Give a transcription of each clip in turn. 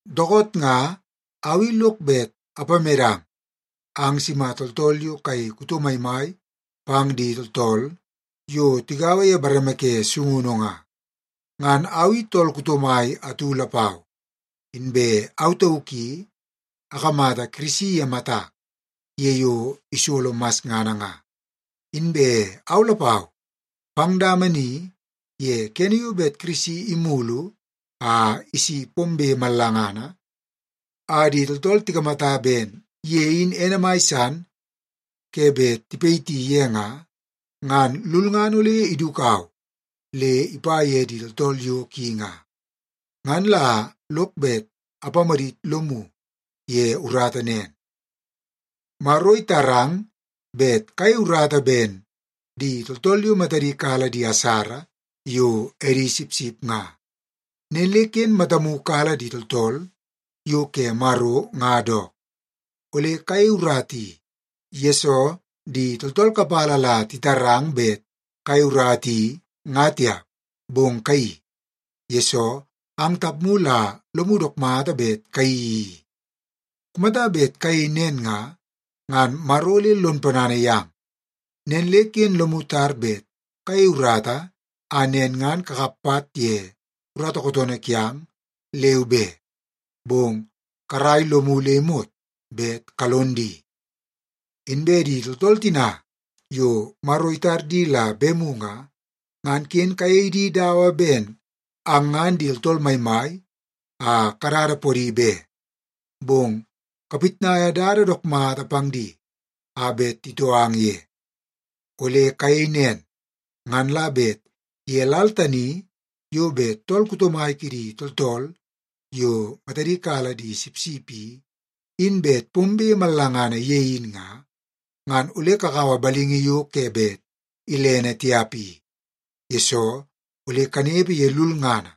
Dookoot nga au i lok bet apamedang ang sima tooltool yo kayei kuto maimai pang di tooltool yo tigaua ye bareme ke sungunu nga. Ngan au i tool kuto mai atu lapau, inbe au tauk i akamata Kirisi ye matak ye yo isolo masngana nga. Inbe au lapau, pang dama ni ye kene yo bet Kirisi imulu a isi pombe mallangana a di tooltool tikamata ben ye in ene mai san ke bet tipayiti ye nga, ngan lulngana ole idukau le ipa ye di tooltool yo ki nga. Ngan la lok bet apamadit lomu ye urata nen. Maro itarang bet kayei urata ben di tooltool yo matadi kala di asara yo edi sipsip nga. Nen le ken matamu kala di tooltool yo ke Maro nga dook. Ole kayei urata i, yesoo di tooltool kapala la titarang bet kayei urata i nga tiap, bong kayeii, yesoo ang tapmu la lomu dook mata bet kayeii i. Kumata bet kayei nen nga, ngan Maro ole lon ponana yang. Nen le ken lomu tar bet kayei urata a nen ngan kakap pat ye urata kootoonoo kiang, leu be, bong karai lomu le imot bet kalon di. Inbe di tooltool tina yo Maro itar di la bemu nga, ngan ken kayei di dawa ben ang ngan di tooltool maimai a kadada podi be. Bong kapitnaia dada dook mata pang di a bet titoo ang ye. Ole kayei nen, ngan la bet ye lal tani yo bet tool kuto mai kidi tooltool yo matadi kala di sipsip i, in bet pombe mallangana ye in nga, ngan ole kakaua balingi yo ke bet ilene tiap i, yesoo ole kanepe ye lulngana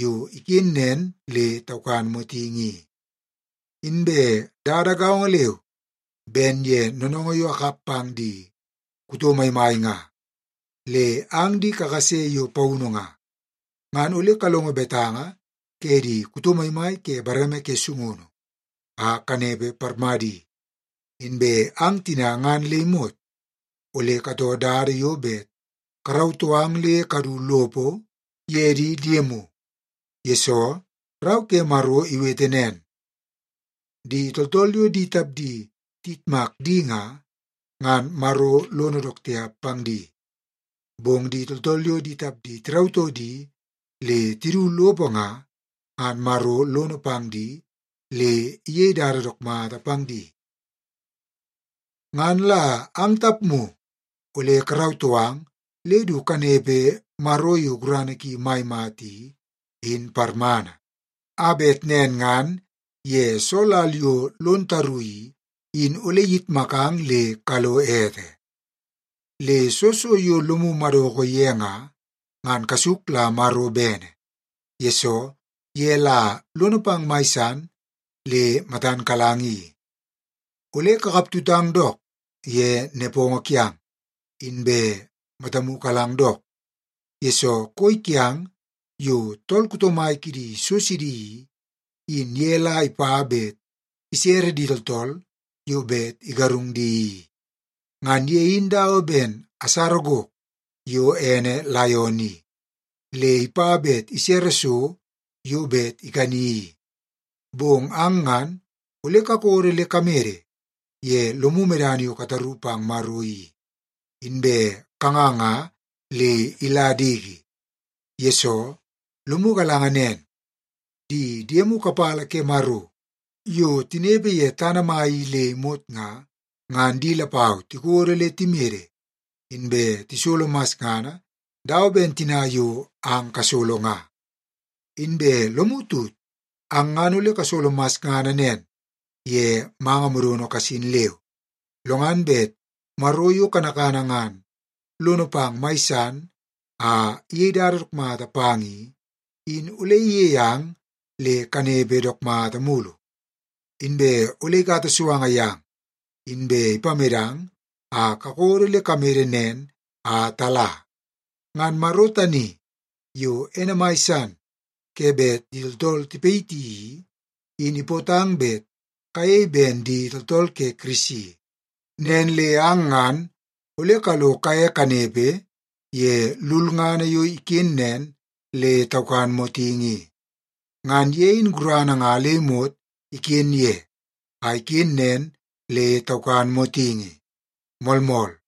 yo iken nen le taukan motingi i. Inbe dada gaongo leu ben ye noonoongoo yo akap pang di kuto maimai nga, le ang di kakase yo paunu nga, ngan ole kalongo betanga ke di kuto maimai ke bareme ke sungunu a kanepe parmadi. Inbe ang tina ngan le imot ole katoo dada yo bet karautoo ang le kadu lopo ye di diemu, yesoo Rau ke Maro iwete nen, “Di tooltool yo di tapdi tiyitmak di nga, ngan Maro lono dook tiap pang di. Bong di tooltool yo di tapdi tirautoo di le tidu lopo nga, ngan Maro lono pang di le iyei dada dook mata pang di.” Ngan la ang tapmu ole karautoo ang le du kanepe Maro yo gurana ki mai mata i, in parmana, a bet nen ngan ye soo lal yo lon taru i, in ole iyitmakang le kalo ete. Le soo so yo lomu madoko ye nga, ngan kasuk la Maro bene, yesoo ye la lono pang mai san le matan kalang i. Ole kakaptutang dook ye nepongo kiang, inbe matamu kalang dook, yesoo koi kiang yo tool kuto mai kidi so sidi i, in ye la ipa bet isere di tooltool yo bet igarung di i. Ngan ye in dawa ben asara gok yo ene laion i, le ipa bet isere so yo bet ikani i. Bong ang ngan ole kakodo le kamede ye lomu medana yo kataru pang Maro i, inbe kanganga le ila diki. Yesoo, lomu galanga nen, di diemu kapala ke Maro yo tinepe ye tana mai i le imot nga, ngan di lapau tikodo le timede inbe tisolo masngana dawa ben tina yo ang kasolo nga. Inbe lomu tut, ang ngan ole kasolo masngana nen ye manga modono kasin leu, lo ngan bet Maro yo kanakana ngan lono pang mai san a iyei dada dook mata pang i, in ole iyei ang le kanepe dook mata mulu. Inbe ole ikata suanga yang, inbe ipamedang a kakodo le kamede nen a tala. Ngan Maro tani yo ene mai san ke bet di tooltool tipayiti i, in ipootang bet kayei ben di tooltool ke Kirisi, nen le ang ngan ole kalo kaye kanepe ye lulngana yo iken nen le taukan motingi i. Ngan ye in gurana nga le imot iken ye a iken nen le taukan motingi. Moolmool.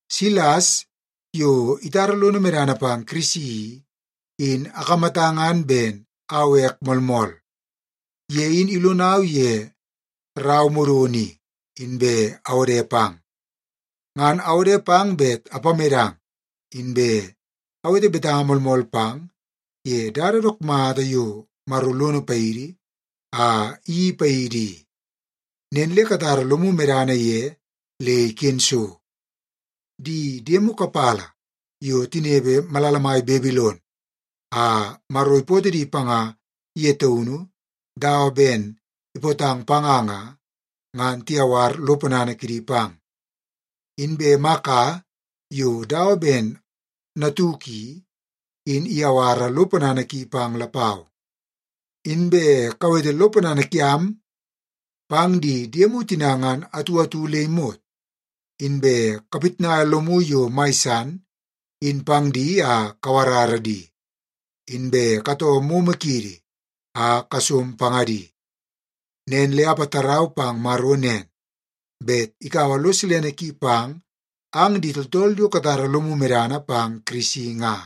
Silas, yo itara lono medana pang Kirisi i, in akamata ngan ben au ek moolmool. Ye in ilonau ye rau modono i, inbe awode pang. Ngan awode pang bet apamedang, inbe awete betanga moolmool pang ye dada dook mata yo Maro lono paidi a iyeii paidi i. Nen le katara lomu medana ye le iken so. Di diemu kapala yo tinepe malala mai Babilon a Maro ipootoo di panga ye taunu dawa ben ipootang panga nga, ngan tiyawar lo ponana kidi pang. Inbe Maka yo dawa ben natuk i, in iyawara lo ponana ki pang lapau. Inbe kawete lo ponana kiang pang di diemu tina ngan atu atu le imot, inbe kapitnaia lomu yo mai san in pang di a kawarara di, inbe katoo momo kiidi a kasom pangadi. Nen le apatarau pang Maro nen, bet ikaua lo silene ki pang ang di tooltool yo katara lomu medana pang Kirisi nga.